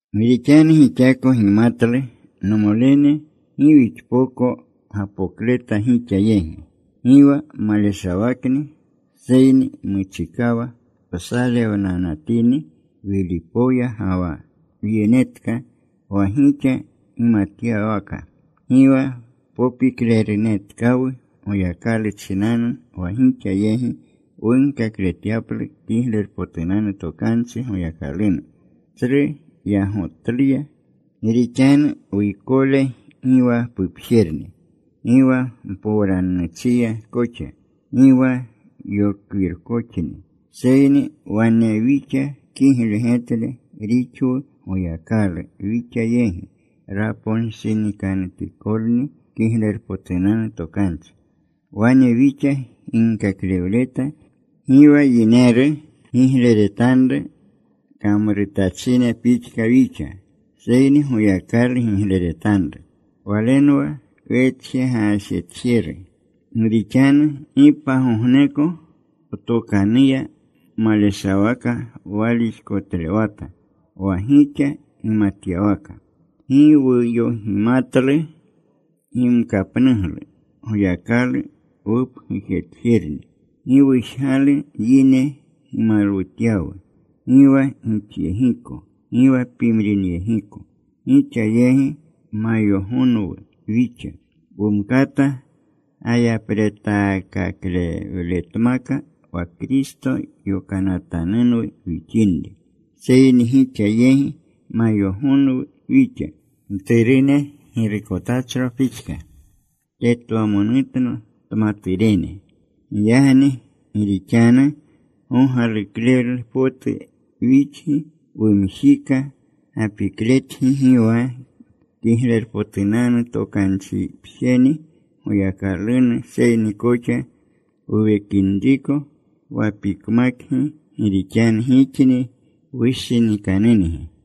Gi rixanu gixako gimatlu, nomolene, gi wixpoko gapokleta gixa yegi. Gi wa maleshawakni. Seyni muchikawa wsalewnanatini Wilipoya ga wa wyenetka, wa gixa gimatyawaka. Gi wa popiklerunetkawu Goyakalu chinanu wa gixa yegi wunkakletyaplu Kiglerpotunanu Tokanchi Goyakalunu, tsru yagotluya. Gi rixanu wuykole gi wa pupjerni. Gi wa mpowranuchiya koxa. Gi wa yokwirkoxni. Seyni wane wixa kigle getle rixwu Goyakalu wixa yegi raponshinikanutikolni Kiglerpotunanu Tokanchi. Wane wixa ginkaklewleta. Gi wa yineru gigleretanru kamrutachine pixka wixa, seyni Goyakalu gigleretanru. Walenwa wetjegaajetjeru. Gi rixanu gi pagogneko wtokanuya maleshawaka walixkotlewata wa gixa gimatyawaka. Gi wuyogimatlu gimkapnuglu. Goyakalu wupgujtatjerni. Gi wujgalu yine gimalwutyawu, gi wa gixyegiko, gi wa pimrinyegiko. Gixa yegi mayogonwu wixa. Wumkata gayapretaakaklewletmaka wa Kristo yokanatanunwu wixinri. Seyni gixa yegi mayogonwu wixa mturune girukotachro pixka tetwamonutna tmaturene. Giyagni gi rixanu gogaluklewlu potu wixgi, wumjika gapikletgi gi wa Kiglerpotunanu Tokanchipjeni Goyakalunu, seyni koxa wuwekinriko wapikmakgi, gi rixanu gixni wushinikanungi.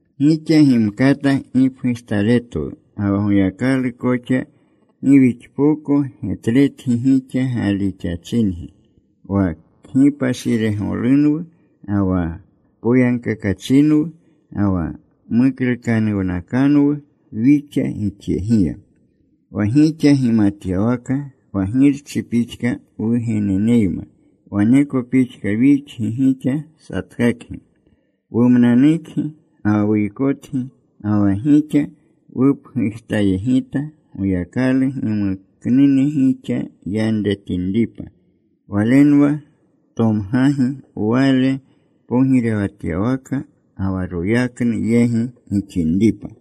Gixa gimkata gipgujtaletwu ga wa Goyakalu koxa gi wixpoko getletgi gixa galixachingi. Wa kgipashiregolunwu, ga wa poyagkakachinwu, ga wa muklukanuwnakanwu wixa gixyegiya. Wa gixa gimatyawaka, wa girchi pixka wugeneneyma waneko pixka wixgi gixa satkakgi. Wumnanukgi ga wa wuykotgi. Ga wa gixa wupgujtayegita, Goyakalu gimuknune gixa yanretinripa. Walenwa tomgagi Wale pogirewatyawaka ga wa royaknu yegi gixinripa.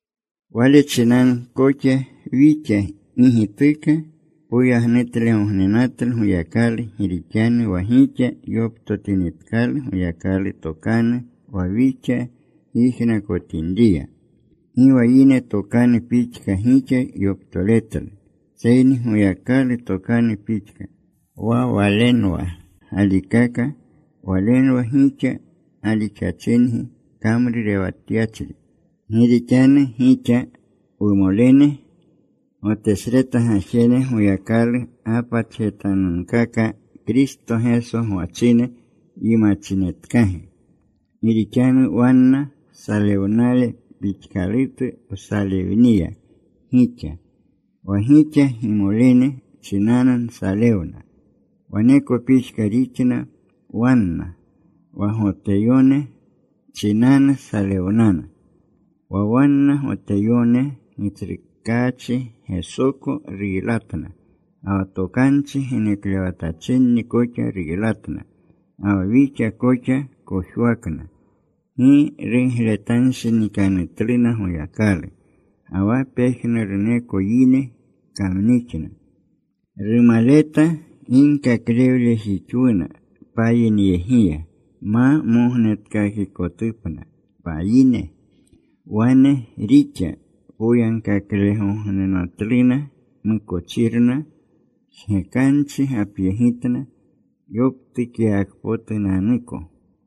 Wale chinanu koxa wixa gi gituka poyagnutlegognenatlu Goyakalu gi rixanu wa gixa yoptotinitkalu Goyakalu tokanu wa wixa gyijnakotinriya, gi wa yine tokanu pixka gixa yoptoletlu, seyni Goyakalu tokanu pixka. Wa walenwa galikaka. Walenwa gixa galixachingi kamrurewatyachri. Gi rixanu gixa, wumolene, Gotesreta gajene Goyakalu gapatjetanunkaka Kristo Geso gwachine yimachinetkagi. Gi rixanu wanna salewnale pixkalutu nsalewniya gixa. Wa gixa gimolene chinanu nsalewna, waneko pixka rixna wanna: wa Goteyone chinanu salewnana. Wa wanna Goteyone Gitsrukaachi Gesoko ruylatna, ga wa tokanchi geneklewatachinni koxa ruylatna, ga wa wixa koxa kojwakna. Gi rugletanshinikanutluna Goyakalu, ga wa pejnuruneko yine kamnixna. Rumaleta ginkaklewlejixwuna payinyegiya ma mognetkakikotupna payine. Wane rixa poyagkaklegognenatluna mukochirna. Jgekanchi gapyegitna yoptukyawakpotunanuko.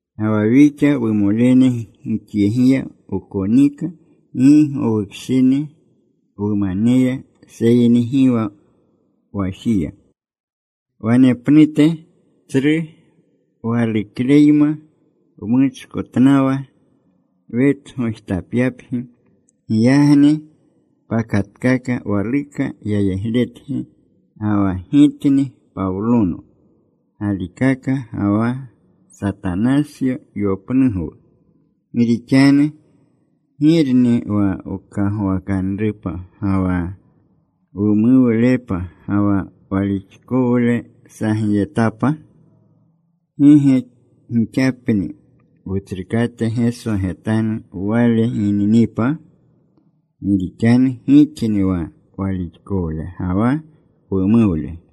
Ga wa wixa, wumolene, gixyegiya wkonika gi gowukshini wumaneya seyni gi wa wajiya, wanepnute tsru walukleyma wmuchkotnawa wetgojtapyapgi. Giyagni pakatkaka waluka yayegletgi, ga wa gitni Pawlono galikaka, ga wa Satanasyo yopnugwu. Gi rixanu ¿girni wa wkagwakanrupa ga wa wumuwlepa, ga wa walixkowle sagyetapa? ¿Gi ge gixapni, Wutsrukate Geso getanu Wale gininipa? Gi rixanu gixni wa walixkowle ga wa wumuwle.